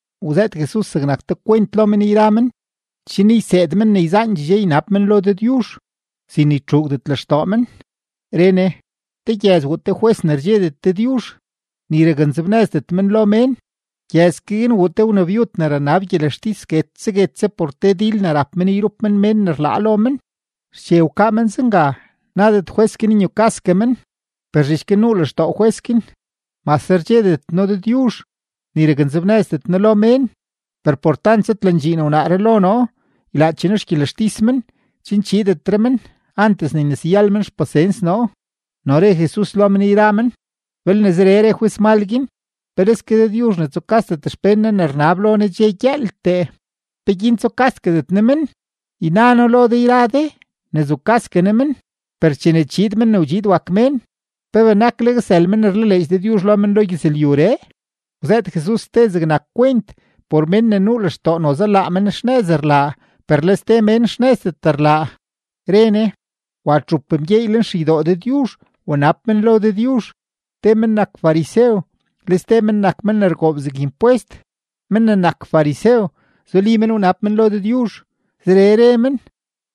Wzëët Jesus zegnak te kwent lo men yra men chen yseed men ne yzaandxee dxe ynab men lo Dëdyuzh, sin ne ytxuugdet lextoo men. Re Ne: ―Te gyëz wuu te jwes ne rdxedet Dëdyuzh, ni raknzebnëzdet men lo mén. Gyëz ke guin wuu te wnabyud ne ranab gyelextis guetse guetse por te dil ne rap men yrup men mén ne rlaa lo men. Xche wkaa men zenga, nadet jwes guin nyukasgue men, per zhich guin nuu lextoo jwes guin: “Mase rdxedet noo Dëdyuzh, ni raknzebnëzdet noo lo mén, per por tant zëdlandxiin wnaaree lo noo, ylaache noo xgyelextis men chen chiidetre men, antes ne yneseyal men xpasens noo.” No re Jesus lo men yra men: ―Belne zeree re jwes mal guin, ¡peleske Dëdyuzh ne tsukasdet xpén Ne ne rnab lo Ne dxe gyëëltee! ¿Peguin tsukasdetgue Ne men? Yna noo lo de yra de ne zukasgue Ne men. Per chene chiid Men ne wdxiid wak Mén, ¿pe benakleg sël mén ne rlaleedx Dëdyuzh lo men lo gyëzlyuree? Wzëët Jesus ste zegnak kwent por mén ne nuu lextoo noze laa men xnëz rlaa per le ste mén xnëzdet rlaa, re Ne: ―Wa txup mgyeey lenxeydoo Dëdyuzh wnab men lo Dëdyuzh: te men nak farisew, le ste men nak men ne rgoob zeg impwest. Men ne nak farisew, zuli men wnab lo Dëdyuzh, zeree re men: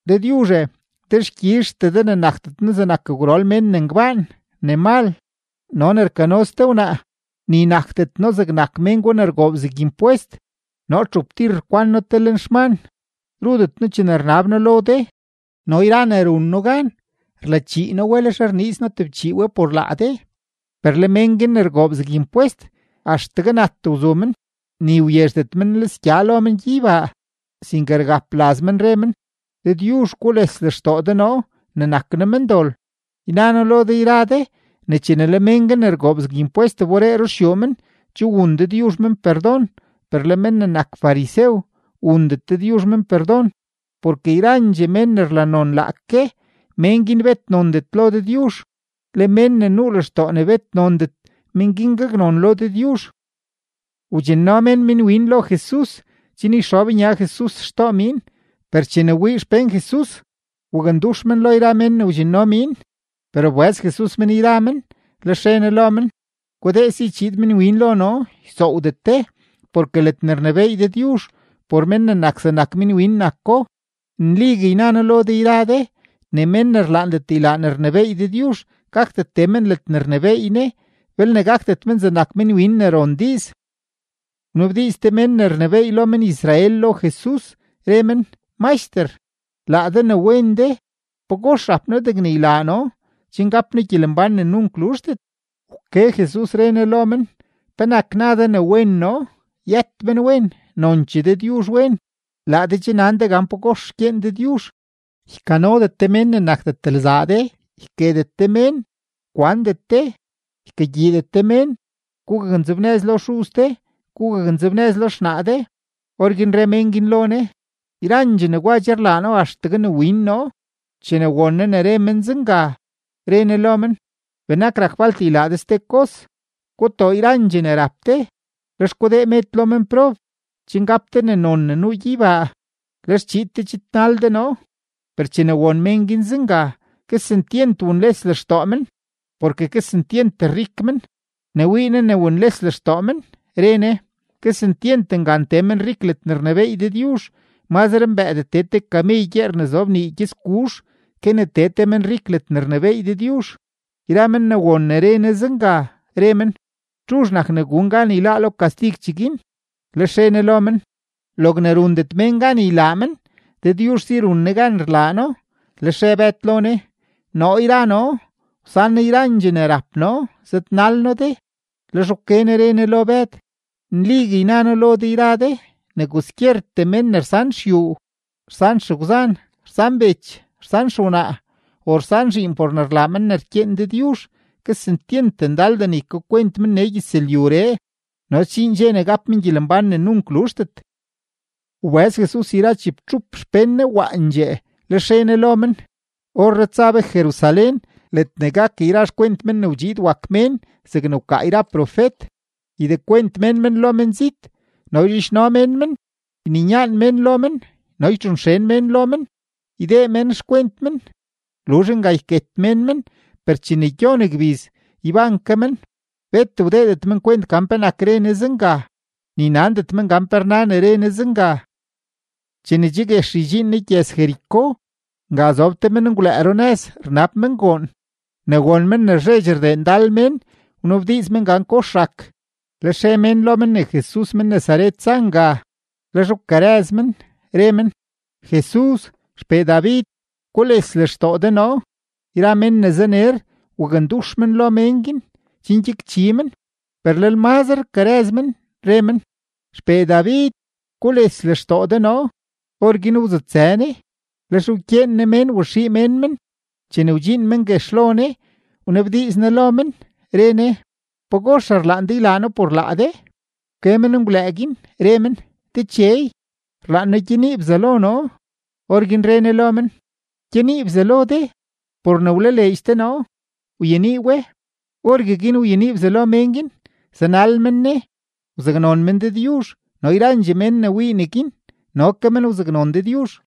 “Dëdyuzhe, dexkyizhtee de ne nakdet noo zegnak gwrol mén ne ngbaan, ne mal, no ne rkano ste wnaa; ni nakdet noo zegnak mén gwa ne rgoob zeg impwest. Noo txup tir rkwan noo te leen xman, rudet noo chene rnab noo lo de, no yra ne run noo gan, rlachii noo we, lex rniiz noo tebchii we por laa de.” Per le men guin ne rgoob zeg impwest, axtegue nat wzu men, ni wyezhdet men nlisgya lo men gyeybaa, sinke rgap laz men, re men: “¡Dëdyuzh, gules lextoo de noo ne nak noo mendol!” Yna noo lo de yra de ne chene le men guin ne rgoob zeg impwest wberee ruxyuu men, che wun Dëdyuzh men perdon, per le men ne nak farisew, wundet Dëdyuzh men perdon. Porke yrandxee mén ne rlanon laake, mén guin bet nondet lo Dëdyuzh; le mén ne nuu lextoo ne bet nondet, mén guin gaknon lo Dëdyuzh. Wdxinno mén minwin lo Jesus chen yxob nya Jesus xtoo miin; per chene wii xpén Jesus, wakndux men lo yra men ne wdxinno miin. Per wbëz Jesus men yra men, lex re Ne lo men: ―Gudee si chiid minwin lo noo, ysoowdet de, porke ledne rnebééy Dëdyuzh, por mén ne nak zegnak minwin nako. Nligue yna noo lo de yra de ne mén ne rlaandet ylaa ne rnebééy Dëdyuzh gakdet tee men ledne rnebééy Ne belne gakdet men zegnak minwin ne ron diiz. Wnabdiiz te mén ne rnebééy lo men-Israel lo Jesus, re men: ―Maxter, laa de ne wen de, ¿pagox rap noo degne ylaa noo chen gap noo gyelembán ne nunk luzhdet? Wke Jesus, re Ne lo men: ―¿Penak na de ne wen noo? Yët menwen; nonchee Dëdyuzh wen. Laa de che nan de gan pagox rkyeen Dëdyuzh: “Ykanodet de mén ne nakdet lzaa de, yketet de mén, kwandet de, ykagyiidet de mén, gugaknzebnëz lo xuz de, gugaknzebnëz lo xnaa de.” Orguin re mén guin lo Ne: ―Yrandxee negwa che rlaa noo axtegue ne win noo. Chene won Ne ne re men zenga, re Ne lo men: ―Benak rak falt ylaa de ste kos: gutoo yrandxee ne rap de, lex gudee med lo menprob, chen gap de ne non ne nuu gyeybaa; lex chiid de chidnal de noo. Per chene won mén guin zenga, kesentyent wunles lextoo men, porke kesentyent rik men. Ne wii Ne ne wunles lextoo men, re Ne: ―¡Kesentyent ngan tee menrik ledne rnebééy Dëdyuzh! Mazre mbëëdee tee te kamey gyeer ne zob nii gyëtsguzh ke ne tee te menrik ledne rnebééy Dëdyuzh. Yra men ne won ne re Ne zenga, re men: ―¿Txuzh nak ne gun gan yláá lo kastig cheguin? Lex re Ne lo men: ―Logne rundet mén gan ylaa men, Dëdyuzh si run Ne gan rlaa No. Lex re Bëd lo Ne: ―Noo yra noo, wsan noo yrandxee ne rap noo, zëdnal noo de. Lex wke Ne re Ne lo Bëd: ―Nligue yna noo lo de yra de ne kwaskyertee mén ne rsan xyuu, rsan xegwzan, rsan bech, rsan xewnaa, o rsan zhiin por ne rlaa men ne rkyeen Dëdyuzh, kesentyent ndaldee ne ykakwent men nee gyëzlyuree, no sdxiin dxe ne gap men gyelembán ne nunk luzhdet. Wbëz Jesus yra chibtxup xpén Ne waandxee, lex re Ne lo men: ―Orree tsa be Jerusalén ledne gak yra xkwent Men ne wdxiid wak Mén zegne wkaa yra profet. Ydekwent mén men lo menzit, no yzhidxno mén men, yninyaan mén lo men, no ytxonxen mén lo men. Ydee mén xkwent men; luzh nga yket mén men; per chene gyon gbiz, yban ke men. Bet wdeedet men kwent gan penak re Ne zenga, ni nandet men gan pe rna ne re Ne zenga. Chene che guex ydxiin Jesus gyëz-Jericó, nga zob te menngwlëë runëz rnab men goon. Ne won men ne rzheedx rdee ndal mén, wnabdiiz men gan kox rak. Lex re mén lo men ne Jesus men-Nazaret za nga. Lex wkarëz men, re men: ―¡Jesus, XPee David, gules lextoo de noo! Yra mén ne zaner wakndux men lo mén guin chen gyakchi men, per lel mazre rkarëz men, re men: ―¡XPee David, gules lextoo de noo! Orguin wzutsë Ne, lex wkyeen Ne mén waxii mén men. Chene wdxiin men guex lo Ne, wnabdiiz Ne lo men, re Ne: ―¿Pagox rlaan de ylaa noo por laa de? Wke menngwlëë guin, re men: ―Dechey, rlaan noo gyenii bzalo noo. Orguin re Ne lo men: ―¡Gyenii bzalo de! Por ne wlaleedx de noo, wyenii we. Orgueguin wyenii bzalo mén guin; zanal men Ne, wzaknon men Dëdyuzh. No yrandxee mén ne wii neguin, no ke men wzaknon Dëdyuzh.